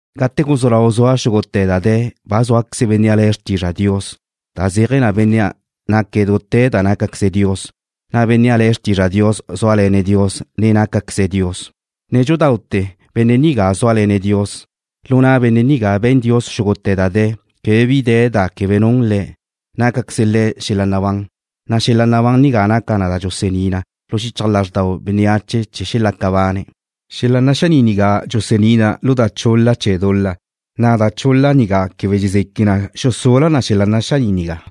Gate guzú lau zua xúgute̱ da de̱, ba zúaqueze Bénnea' le̱' Xrtizra' Dios, da zéaje̱ na Benne' naque̱' dute̱ da nácaqueze Dios, na' Bénnea' le̱' Xrtizra' Dios zúale̱ne̱' Dios, ne nácaqueze̱' Dios. Nédxudaute̱ Benne' nigá zúale̱ne̱' Dios. Lu na' Benne' nigá be̱n Dios xúgute̱ da de̱. Quebe bi de̱ da quebe nun Le̱'. Nácaqueze Le̱' xel-la' nabán, na' xel-la' nabán nigá naca na da dxusení na lu xichaj lázrdau bénneache chee̱ xelaca bane̱'. Xel-la' naxaní' nigá dxusení na lu da chul-la chee̱ dul-la da zaj nabaga bénneache, na' da chul-la nigá quebe dxezeque na xusula na xel-la' naxaní' nigá.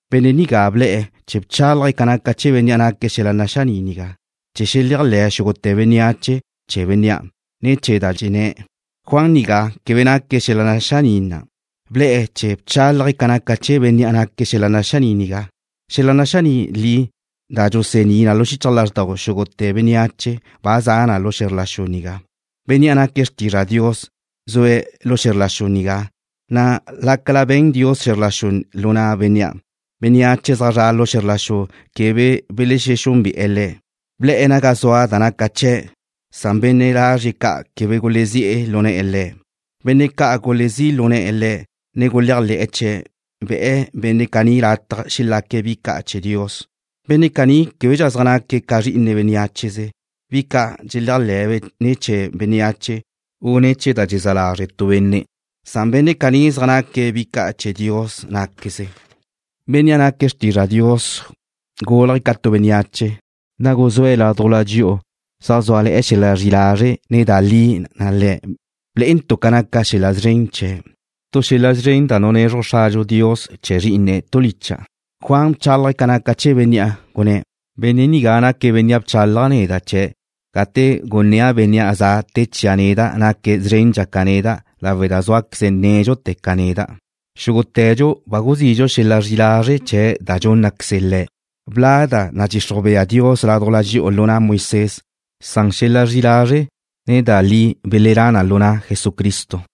Benne' nigá ble̱'e̱ chee̱ bchálaje̱' ca naca chee̱ Bénnea' naque̱' xel-la' naxaní' nigá, chee̱ xeléajle̱ xúgute̱ bénneache chee̱ Bénnea' ne̱ chee̱ da dxenné̱'. Juan nigá quebe naque̱' xel-la' naxaní' na'. Ble̱'e̱ chee̱ bchálaje̱' ca naca chee̱ Bénnea' naque̱' xel-la' naxaní' nigá. Xel-la' naxaní' li, da dxusení na lu xichaj lázrdau xúgute̱ bénneache ba za' la' na lu xe̱zr la xu nigá. Bénnea' naque̱' Xrtizra' Dios zue̱' lu xe̱zr la xu nigá, na' lácala be̱n Dios xe̱zr la xu lu na' Bénnea', bénneache zaj zre̱'e̱ lu xe̱zr la xu quebe belexexúnbe'e̱ Le̱'. Ble̱'e̱ naga zua da naca chee̱', na' benne' lazrie̱' ca' quebe gulezí' lu ne̱'e̱ Le̱'. Benne' ca' gulezí' lu ne̱'e̱ Le̱', ne guléajle̱'e̱ chee̱', be̱'e benne' caní lataj xelaque̱' bi ca' chee̱ Dios. Benne' caní québedxa zaj naque̱' ca zri'ine bénneacheze, bi ca' dxelálajbe' ne̱ chee̱ bénneache, u ne̱ chee̱ da dxezá lazre' tu benne'. Benne' caní zaj naque̱' bi ca' chee̱ Dios ná'queze. Bénnea' naque̱' Xrtizra' Dios gúlaje̱' ca tu bénneache, na' guzúe̱' ládujla dxi'u, zaj zúale̱ xel-la' zri'i lazre', ne da li Le̱'. Blé'entu' ca naca xel-la' szren chee̱', tu xel-la' szren da nunezruj Xradxu Dios chee̱ Zrí'ine̱' tu licha'. Juan bchálaje̱' ca naca chee̱ Bénnea', gunné̱': ―Benne' nigá naque̱' Bénnea' bchálaja' neda' chee̱' gate gunnéa' Bénnea' ze̱'e̱ te chia' neda' naque̱' szrendxa ca neda' lawe' da zúaqueze̱' nédxute̱ ca neda'. Xúgute̱dxu ba guzidxu xel-la' zri'i lazre' chee̱' da dxúnnaqueze Le̱'. Bla' da nadxixruj bea Dios ládujla dxi'u lu na' Moisés, na' xel-la' zri'i lazre', ne da li belelá' na lu na' Jesucristo.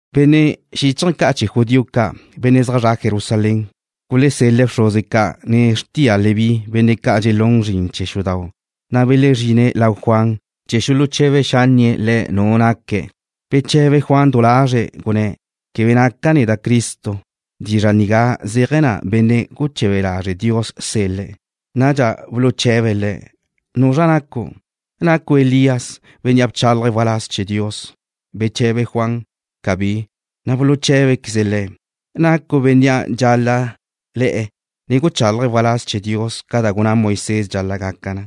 Benne' xíchaje̱ ca' chee̱ judío ca', benne' zaj zre̱'e̱ Jerusalén, gulesel-le̱' bxruze ca', ne xrtia Leví, benne' ca' dxelune̱' zrin chee̱ xudau', na' belezrine̱' lau Juan chee̱ xuluche̱be xánnie̱' le̱' nu naque̱'. Beche̱be Juan du lazre̱', gunné̱': ―Quebe naca' neda' Cristo. (Dizra' nigá zéaje̱ na Benne' guche̱be lazre' Dios sel-le̱'.) Nadxa buluche̱be̱' le̱': ―¿Nuzra nacu'? ¿Nacu' Elías, bénnea' bchálaje̱' waláz chee̱ Dios? Beche̱be Juan: ―Cabí. Na' buluché̱bequeze̱' le̱': ―¿Nacu' bénnea' dxal-la' le̱'e̱, ne guchalaje̱' waláz chee̱ Dios, ca da gunná Moisés dxal-la' gaca na?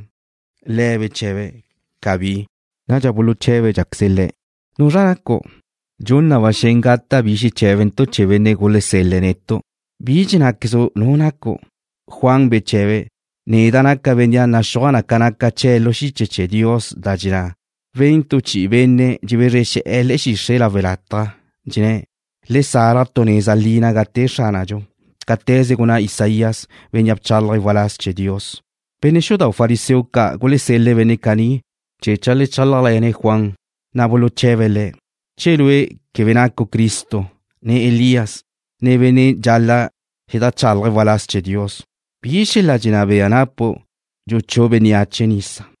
Le̱' beche̱be̱': ―Cabí. Nadxa buluché̱bedxaqueze̱' le̱': ―¿Nuzra nacu'? Dxun na ba xen gata' bi xeché̱bentu' chee̱ benne' gulesel-le̱' netu'. ¿Bi dxennáquezu' nu nacu'? Juan beche̱be̱': ―Neda' naca' bénnea' naxúaj na ca naca chee̱' lu xiche chee̱ Dios, da dxenná: Wen chi'i tu benne' dxebezre xe̱'e̱ le̱'e̱ xixre' lawe' lataj, dxenné̱': “Le salaj tu neza li naga te Xránadxu.” Naquen cáte̱ze gunná Isaías, bénnea' bchalaje̱' waláz chee̱ Dios. Benne' xudau' fariseo ca' gulesel-le̱' benne' caní chee̱ cheajlechálajle̱ne̱' Juan. Le̱' buluche̱be̱' le̱': ―Che lue' quebe nacu' Cristo, ne Elías, ne bénnea' dxal-la' xedajchalaje̱' waláz chee̱ Dios, ¿bi xel-la' dxenná bea napu' dxuchú' bénneache nisa?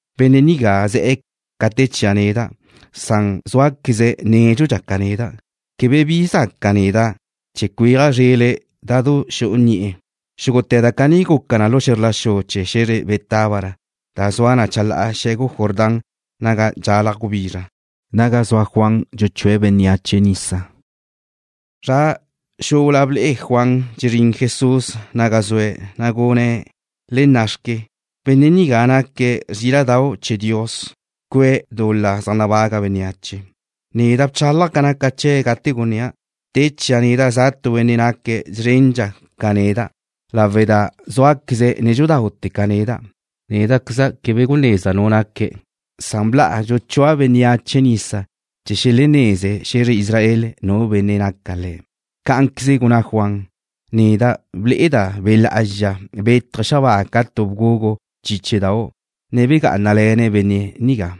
Benne' nigá ze̱'e̱ ca te chia' neda', na' zúaqueze̱' nédxudxa ca neda'. Quebe zaca' neda' cuéaja' zrele̱' da xu'u ni'e̱. Xúgute̱ da caní guca na lu xe̱zr la xu chee̱ xe̱zre Betábara, da zua na chalá'a xe̱gu Jordán naga dxalaj gubizra, naga zua Juan dxuchúe̱' bénneache nisa. Zra xula ble'e Juan dxezrín Jesús naga zue̱', na' gunné̱': ―¡Le nna'xque! Benne' nigá naque̱' Zríla'dau' chee̱ Dios, cue̱' dul-la zaj nabaga bénneache. Neda' bchálaja' ca naca chee̱' gate gunnéa': Te chia' neda' za tu benne' naque̱' szrendxa ca neda' lawe' da zúaqueze̱' nédxudaute̱ ca neda'. Néda'queza' quebe gunezda' nu naque̱'. Bla'a dxuchúa' bénneache nisa chee̱ xeleneze xe̱zre Israel nu Benne' naca Le̱'. Cá'anqueze gunná Juan: ―Neda' ble'eda' Be' Lá'azxa bétaje̱' xabáa ca tu bgugu chíchedau', ne begá'anale̱ne̱' Benne' nigá.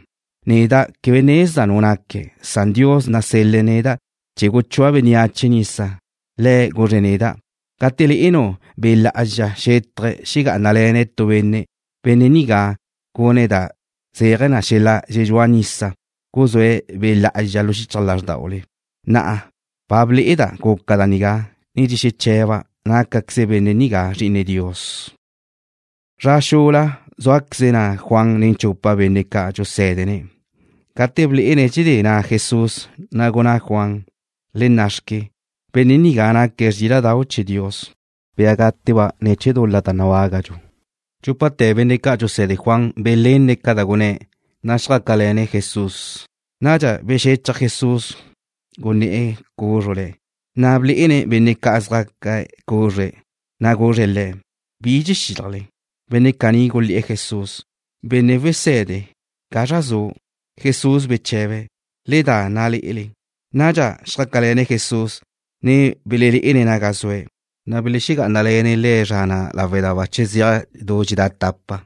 Neda' quebe ne nezda' nu naque̱'. Dios na' nasel-le̱' neda' chee̱ guchúa' bénneache nisa, Le̱' guzre̱' neda': “Gate le'enu' Be' Lá'azxa xétaje̱' xegá'anale̱ne̱' tu benne', Benne' nigá gune̱' da zéaje̱ xel-la' dxedxúa nisa, guzúe̱' Be' Lá'azxa lu xichaj lázrdaule.” Na'a ba ble'eda' guca da nigá, ne dxexeche̱ba' nácaqueze Benne' nigá Zri'ine Dios. Zra xula zúaqueze na' Juan nen chupa benne' ca' dxusé̱dene̱'. Gate blé'ene̱' dxedé na' Jesús, na' gunná Juan: ―¡Le nna'xque! ¡Benne' nigá naque̱' Zríla'dau' chee̱ Dios, bia gáteba' ne̱ chee̱ dul-la nabágadxu! Dxúpate̱ benne' ca' dxuse̱de Juan belenne̱' ca da gunné̱', na' xjácale̱ne̱' Jesús. Nadxa bexechaj Jesús, gunné̱'e̱ cúzrule̱', ne blé'ene̱' benne' ca' zá'aque̱' cúzrule̱', na' guzre̱' le̱': ―¿Bi dxexílajle? Benne' caní gulé̱'e̱ Jesús: ―Benne' Wese̱de, ¿gazra zu'? Jesús beche̱be̱': ―Le da nna'le. Nadxa xjácale̱ne̱' Jesús, ne belelé'ene̱' naga zue̱', na' belexegá'anale̱ne̱' Le̱' zra na' lawe' da bache zeaj du dxedá' tapa.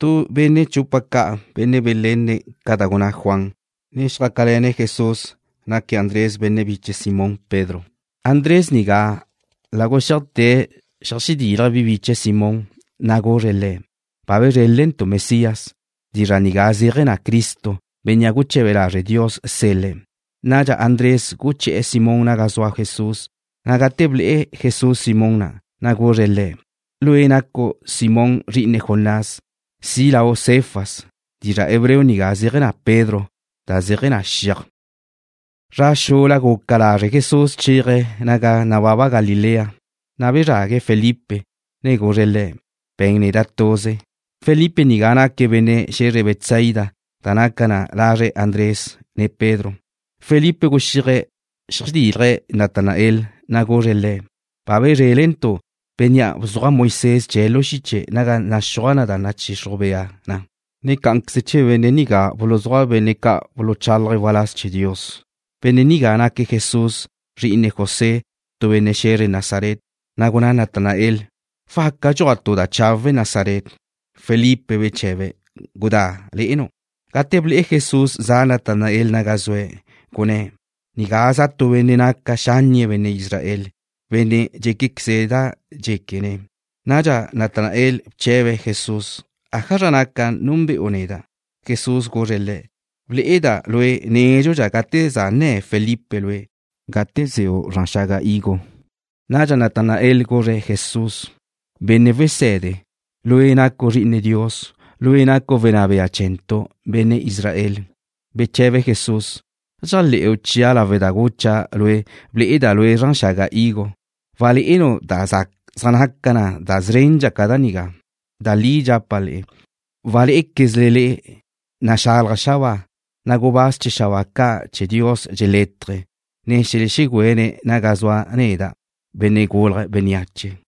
Tu benne' chupa ca', benne' belenne̱' ca da gunná Juan, ne xjácale̱ne̱' Jesús, naque̱' Andrés, benne' biche Simón Pedro. Andrés nigá la guxíajte̱' xeajdílaje̱' bi biche̱' Simón, na' guzre̱' le̱': ―Ba bezrélentu' Mesías. (Dizra' nigá zéaje̱ na Cristo, Bénnea' guche̱be lazre' Dios sel-le̱'.) Nadxa Andrés guché̱'e̱ Simón naga zua Jesús, na' gate ble'e Jesús Simón na', na' guzre̱' le̱': ―Lue' nacu' Simón, zri'ine Jonás. Si' lau' Cefas. (Dizra' hebreo nigá zéaje̱ na: Pedro, da zeaje̱ na: Xiaj.) Zra xula guca lazre' Jesús chéaje̱' naga nababa Galilea, na' bezrague̱' Felipe, ne guzre̱' le̱': ―Be̱n neda' tuze. Felipe nigá naque̱' benne' xe̱zre Betsaida, da naca na lazre Andrés, ne Pedro. Felipe guxíaje̱' xeajdílaje̱' Natanael, na' guzre̱' le̱': ―Ba bezrélentu' Bénnea' bzuaj Moisés chee̱' lu xiche naga zaj naxúaj da nadxixruj bea na, ne cá'anqueze chee̱ Benne' nigá buluzúaj benne' ca' buluchálaje̱' waláz chee̱ Dios. Benne' nigá naque̱' Jesús, zri'ine José, tu benne' xe̱zre Nazaret. Na' gunná Natanael: ―¿Waca dxuaj tu da chawe' Nazaret? Felipe beche̱be̱': ―Gudá le'enu'. Gate ble'e Jesús za Natanael naga zue̱', gunné̱': ―Nigá za' tu benne' naca xánnie̱' benne' Israel, benne' dxenné̱queze̱' da dxéquene̱'. Nadxa Natanael bche̱be̱' Jesús: ―¿Ájazra naca núnbe'u neda'? Jesús guzre̱' le̱': ―Ble'eda' lue' nédxudxa gate za nne̱ Felipe lue', gate ze'u zran xaga higo. Nadxa Natanael guzre̱' Jesús: ―Benne' Wese̱de, Lue' nacu' Zri'ine Dios. Lue' nacu' Wenná Bea chee̱ntu', benne' Israel. Beche̱be Jesús: ―¿Dxéajle̱'u chia' lawe' da gucha' lue' ble'eda' lue' zran xaga higo? Walé'enu' da zaj naca na da szrendxa ca da nigá. Da li dxapa' le'e, walé'equezle le'e naxalaj xabáa, na' gubáz chee̱ xabáa ca' chee̱ Dios dxelétaje̱', ne dxelexegüene̱' naga zua neda', Benne' Gulje̱' Bénneache.